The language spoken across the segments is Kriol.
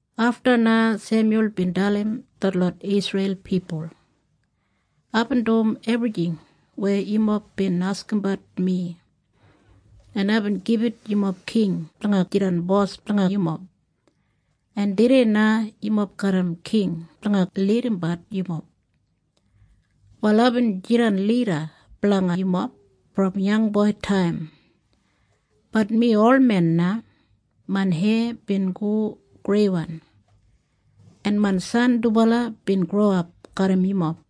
Afta na Semyul bin dalim detlot Isreil pipul, “Aibin dum ebrijing weya yumob bin askimbat mi, en aibin gibit yumob king blanga jidan bos blanga yumob, en tudei na yumob garram king blanga lidimbat yumob. “Wal aibin jidan lida blanga yumob brom yangboitaim. Bat mi olmen na. Main heya bin go greiwan, en main san dubala bin growap garram yumob.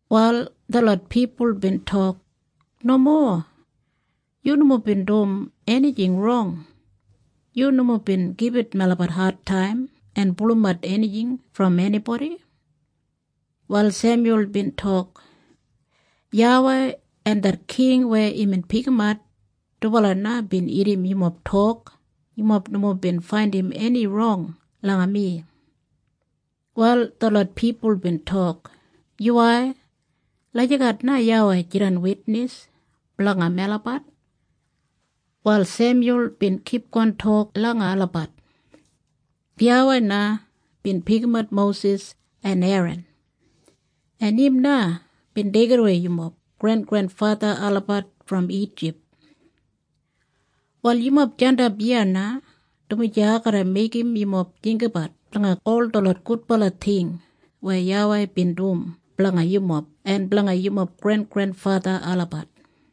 Wal detlot pipul bin tok, “Nomo. Yu nomo bin dum enijing rong. Yu nomo bin gibit melabat adtaim en pulumat enijing brom enibodi.” Wal Semyul bin tok, “YAWEI en det king weya imbin pikimat, dubala na bin irrim yumob tok yumob nomo bin faindim eni rong langa mi.” Wal detlot pipul bin tok, “Yuwai, lagijat na YAWEI jidan witnis blanga melabat.” Wal Semyul bin kipgon tok langa olabat, “YAWEI na bin pikimat Mosis en Eran, en im na bin deigidawei yumob grengrenfatha olabat brom Ijip. “Wal yumob jandap iya na, dumaji ai garra meigim yumob jinggabat blanga ol detlot gudbala ting weya YAWEI bin dum blanga yumob en blanga yumob grengrenfatha olabat.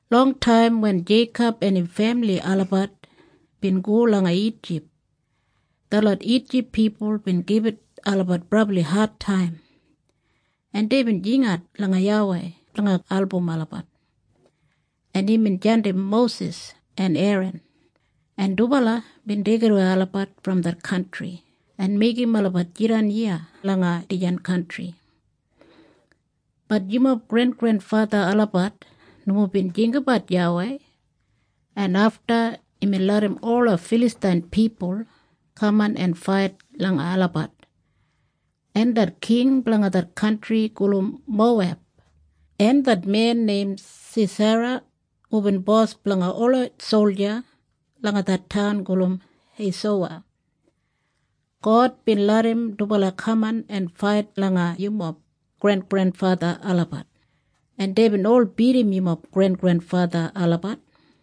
“Longtaim wen Jeikob en im femili olabat bin go langa Ijip, detlot Ijip pipul bin gibit olabat brabli adtaim, en deibin jingat langa YAWEI blanga album olabat, en imbin jandim Mosis en Eran, en dubala bin deigidawei olabat brom det kantri en meigim olabat jidan iya langa dijan kantri. “Bat yumob grengrenfatha olabat nomo bin jinggabat YAWEI, en afta imbin larram ola Filastain pipul kaman en fait langa olabat, en det king blanga det kantri gulum Moweb en det men neim Sisera hubin bos blanga ola solja langa det taun gulum Heisowa, God bin larram dubala kaman en fait langa yumob grengrenfatha olabat, en deibin ol bidim yumob grengrenfatha olabat.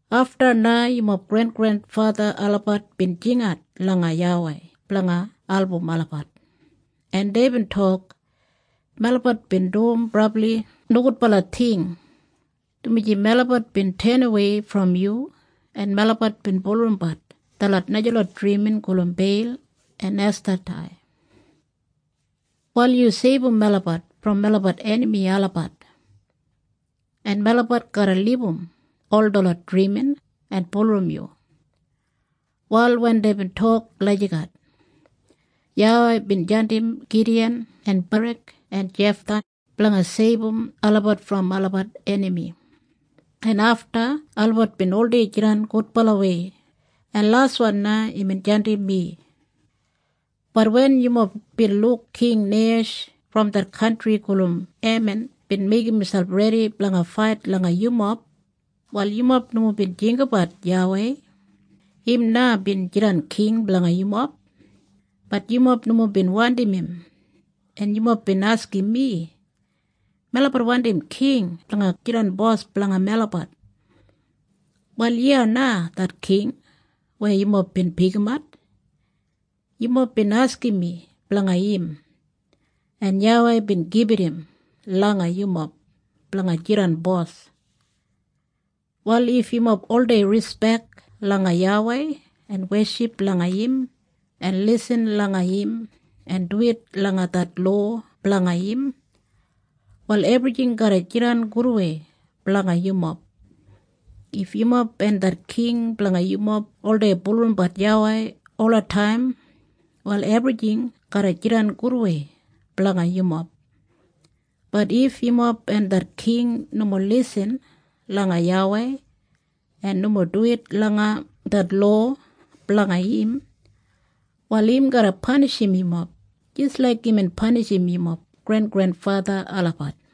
“Afta na yumob grengrenfatha olabat bin jingat langa YAWEI blanga album olabat, en deibin tok, ‘Melabat bin dum brabli nogudbala ting, dumaji melabat bin tenawei brom yu, en melabat bin bulurrumbat detlot najalot drimin gulum Beil en Estatei. Wal yu seibum melabat brom melabat enami olabat, en melabat garra libum ol detlot drimin en bulurrum yu.’ “Wal wen deibin tok lagijat, YAWEI bin jandim Gidiyan en Barak en Jeftha blanga seibum olabat brom olabat enami, en afta olabat bin oldei jidan gudbalawei, en laswan na imbin jandim mi. “Bat wen yumob bin luk King Neihesh brom det kantri gulum Eman bin meigim miselp redi blanga fait langa yumob, wal yumob nomo bin jinggabat YAWEI. Im na bin jidan king blanga yumob. Bat yumob nomo bin wandim im, en yumob bin askim mi, ‘Melabat wandim king blanga jidan bos blanga melabat.’ “Wal iya na det king weya yumob bin pikimat. Yumob bin askim mi blanga im, en YAWEI bin gibit im langa yumob blanga jidan bos. “Wal if yumob oldei rispek langa YAWEI en weship langa im en lisin langa im en duwit langa det lowa blanga im, wal ebrijing garra jidan gudwei blanga yumob. If yumob en det king blanga yumob oldei bulurrumbat YAWEI olataim, wal ebrijing garra jidan gudwei blanga yumob. Bat if yumob en det king nomo lisin langa YAWEI en nomo duwit langa det lowa blanga im, wal im garra panishim yumob jis laik imbin panishim yumob grengrenfatha olabat.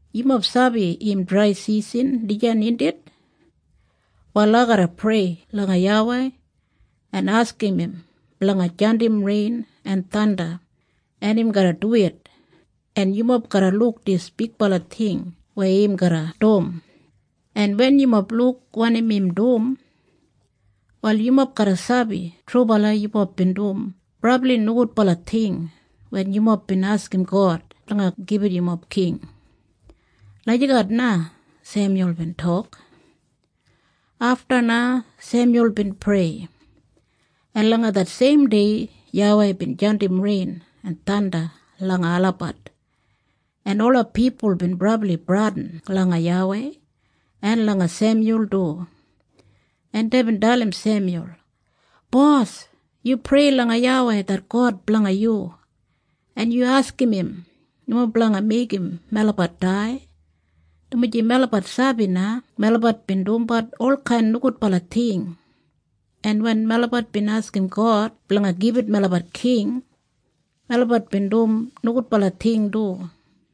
Yumob sabi im draisisan dijan, indit? Wal ai garra prei langa YAWEI en askim im blanga jandim rein en thanda, en im garra duwit, en yumob garra luk dis bigbala ting weya im garra dum, en wen yumob luk wanim im dum, wal yumob garra sabi trubala yumob bin dum brabli nogudbala ting wen yumob bin askim God blanga gibit yumob king.” Lagijat na Semyul bin tok. Afta na Semyul bin prei, en langa det seimdei YAWEI bin jandim rein en thanda langa olabat, en ola pipul bin brabli bradin langa YAWEI en langa Semyul du, en deibin dalim Semyul, “Bos, yu prei langa YAWEI det God blanga yu, en yu askim im nomo blanga meigim melabat dai, dumaji melabat sabi na melabat bin dumbat olkain nogudbala ting, en wen melabat bin askim God blanga gibit melabat king, melabat bin dum nogudbala ting du.”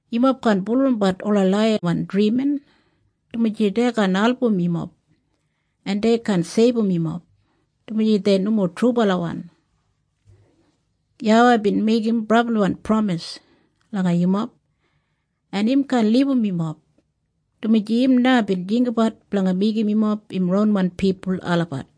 Yumob kaan bulurrumbat ola laiyawan drimin, dumaji dei kaan album yumob, en dei kaan seibum yumob, dumaji dei nomo trubalawan. YAWEI bin meigim brabliwan pramis langa yumob, en im kaan libum yumob, dumaji im na bin jinggabat blanga meigim yumob im ronwan pipul olabat.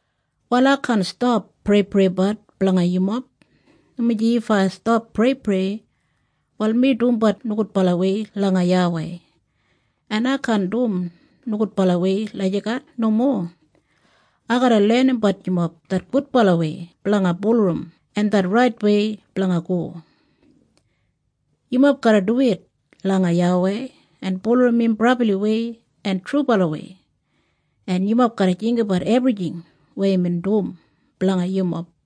“Wal ai kaan stap preipreibat blanga yumob, dumaji if ai stap preiprei, wal mi dumbat nogudbalawei langa YAWEI. En ai kaan dum nogudbalawei lagijat. Nomo. Ai garra lenimbat yumob det gudbalawei blanga bulurrum en det raitwei blanga go. Yumob garra duwit langa YAWEI en bulurrum im brabliwei en trubalawei, en yumob garra jinggabat ebrijing weya imbin dum blanga yumob.